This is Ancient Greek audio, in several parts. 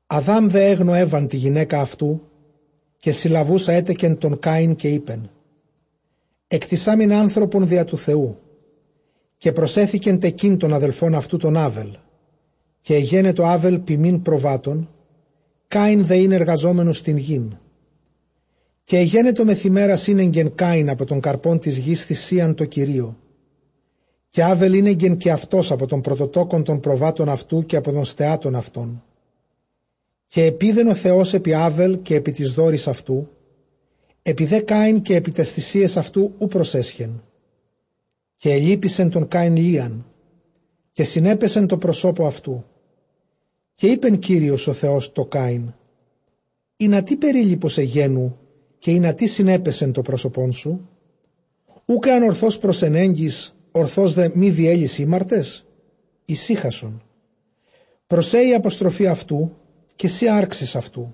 Ἀδὰμ δὲ ἔγνω Εὔαν τὴν γυναῖκα αὐτοῦ, καὶ συλλαβοῦσα ἔτεκε τὸν Κάϊν· καὶ εἶπεν, ἐκτησάμην ἄνθρωπον διὰ τοῦ Θεοῦ. Καὶ προσέθηκε τεκεῖν τὸν ἀδελφὸν αὐτοῦ τὸν Ἄβελ· καὶ ἐγένετο Ἄβελ ποιμὴν προβάτων, Κάϊν δὲ ἦν ἐργαζόμενος τὴν γῆν. Καὶ ἐγένετο μεθʼ ἡμέρας ἤνεγκε Κάϊν ἀπὸ τῶν καρπῶν τῆς γῆς θυσίαν τῷ Κυρίῳ· Καὶ Ἄβελ ἤνεγκε καὶ αὐτὸς ἀπὸ τῶν πρωτοτόκων τῶν προβάτων αὐτοῦ, καὶ ἀπὸ τῶν στεάτων αὐτῶν· καὶ ἐπεῖδεν ὁ Θεὸς ἐπὶ Ἄβελ, καὶ ἐπὶ τοῖς δώροις αὐτοῦ. Ἐπὶ δὲ Κάϊν, καὶ ἐπὶ ταῖς θυσίαις αὐτοῦ, οὐ προσέσχε· καὶ ἐλυπήθη Κάϊν λίαν, καὶ συνέπεσε τῷ προσώπῳ αὐτοῦ. Καὶ εἶπε Κύριος ὁ Θεὸς τῷ Κάϊν, ἵνα τί περίλυπος ἐγένου, καὶ ἵνα τί συνέπεσε τὸ πρόσωπόν σου; Οὐκ ἐὰν ὀρθῶς προσενέγκῃς, ὀρθῶς δὲ μὴ διέλῃς, ἥμαρτες; ἡσυχασον· πρός σὲ ἡ ἀποστροφὴ αὐτοῦ, καὶ σὺ ἄρξεις αὐτοῦ.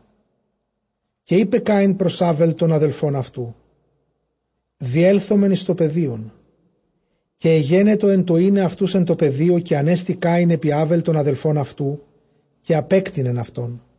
Καὶ εἶπεν Κάϊν πρὸς Ἄβελ τὸν ἀδελφὸν αὐτοῦ, διέλθωμεν εἰς τὸ πεδίον· καὶ ἐγένετο ἐν τῷ εἶναι αὐτοὺς ἐν τῷ πεδίῳ, ἀνέστη Κάϊν ἐπὶ Ἄβελ τὸν ἀδελφὸν αὐτοῦ, καὶ ἀπέκτεινεν αὐτόν.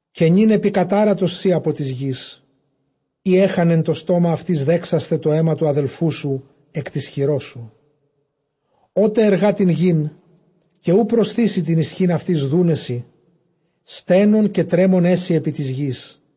Καὶ νῦν ἐπικατάρατος σὺ ἀπὸ τῆς γῆς, ἣ ἔχανε τὸ στόμα αὐτῆς δέξασθαι τὸ αἷμα τοῦ ἀδελφοῦ σου ἐκ τῆς χειρός σου. Ὅτε ἐργᾷ τὴν γῆν, καὶ οὐ προσθήσει τὴν ἰσχὺν αὐτῆς δοῦναί σοι· στένων καὶ τρέμων ἐσῃ ἐπὶ τῆς γῆς.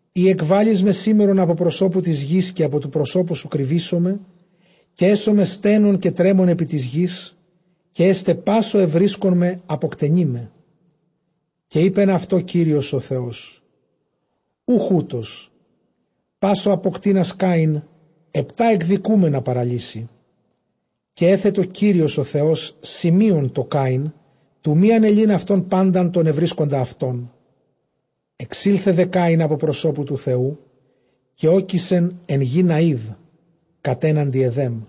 Εἰ ἐκβάλλεις με σήμερον ἀπὸ προσώπου τῆς γῆς, καὶ ἀπὸ τοῦ προσώπου σου κρυβήσομαι, καὶ ἔσομαι στένων καὶ τρέμων ἐπὶ τῆς γῆς, καὶ ἔσται πᾶς ὁ εὑρίσκων με, ἀποκτενεῖ με. Καὶ εἴπεν αὐτῷ Κύριος ὁ Θεὸς, οὐχ οὕτω· πᾶς ὁ ἀποκτείνας Κάϊν, ἑπτὰ ἐκδικούμενα παραλύσει. Καὶ ἔθετο Κύριος ὁ Θεὸς σημεῖον τῷ Κάϊν, τοῦ μὴ ἀνελεῖν αὐτὸν πάντα τὸν εὑρίσκοντα αὐτόν. Ἐξῆλθεν δὲ Κάϊν ἀπὸ προσώπου τοῦ Θεοῦ, καὶ ᾤκησεν ἐν γῇ Ναὶδ κατέναντι Ἐδέμ.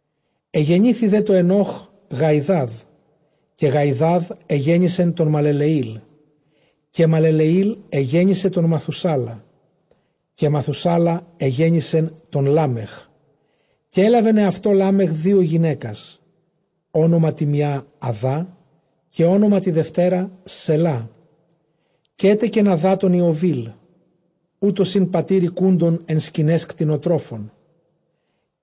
Ἐγενήθη δὲ τῷ Ἐνὼχ Γαϊδάδ· καὶ Γαϊδὰδ ἐγέννησε τὸν Μαλελεὴλ· καὶ Μαλελεὴλ ἐγέννησε τὸν Μαθουσάλα· καὶ Μαθουσάλα ἐγέννησε τὸν Λάμεχ. Καὶ ἔλαβεν ἑαυτῷ Λάμεχ δύο γυναῖκας· ὄνομα τῇ μιᾷ, Ἀδά· καὶ ὄνομα τῇ δευτέρᾳ, Σελλά. Καὶ ἔτεκεν Ἀδὰ τὸν Ἰωβήλ· οὗτος ἦν πατὴρ οἰκούντων ἐν σκηναῖς κτηνοτρόφων.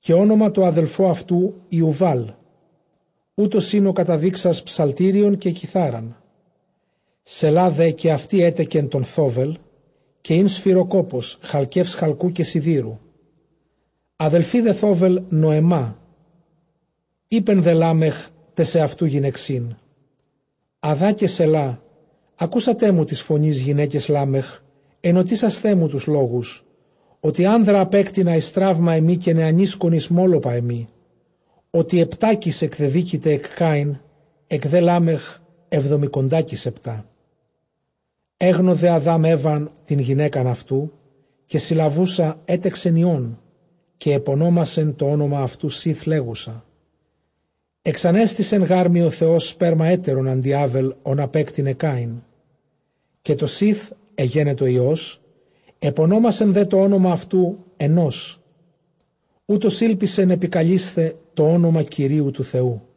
Καὶ ὄνομα τῷ ἀδελφῷ αὐτοῦ, Ἰουβάλ· οὗτος ἦν ὁ καταδείξας ψαλτήριον καὶ κιθάραν. Σελλὰ δὲ καὶ αὐτὴ ἔτεκε τὸν Θόβελ· καὶ ἦν σφυροκόπος χαλκεὺς χαλκοῦ καὶ σιδήρου. ἀδελφὴ δὲ Θόβελ, Νοεμά. Εἶπε δὲ Λάμεχ ταῖς ἑαυτοῦ γυναιξίν, Ἀδὰ καὶ Σελλὰ, ἀκούσατέ μου τῆς φωνῆς, γυναῖκες Λάμεχ, ἐνωτίσασθέ μου τοὺς λόγους· ὅτι ἄνδρα ἀπέκτεινα εἰς τραῦμα ἐμοὶ, καὶ νεανίσκον εἰς μώλωπα ἐμοί. Ὅτι ἑπτάκις ἐκδεδίκηται ἐκ Κάϊν· ἐκ δὲ Λάμεχ, ἑβδομηκοντάκις ἑπτά. Ἔγνω δὲ Ἀδὰμ Εὔαν τὴν γυναῖκα αὐτοῦ· καὶ συλλαβοῦσα ἔτεκεν υἱόν· καὶ ἐπωνόμασε τὸ ὄνομα αὐτοῦ Σὴθ, λέγουσα, ἐξανέστησε γάρ μοι ὁ Θεὸς σπέρμα ἕτερον ἀντὶ Ἄβελ, ὃν ἀπέκτεινε Κάϊν. Καὶ τῷ Σὴθ ἐγένετο υἱός· ἐπωνόμασε δὲ τὸ ὄνομα αὐτοῦ, Ἑνώς· οὗτος ἤλπισεν ἐπικαλεῖσθαι τὸ ὄνομα Κυρίου τοῦ Θεοῦ.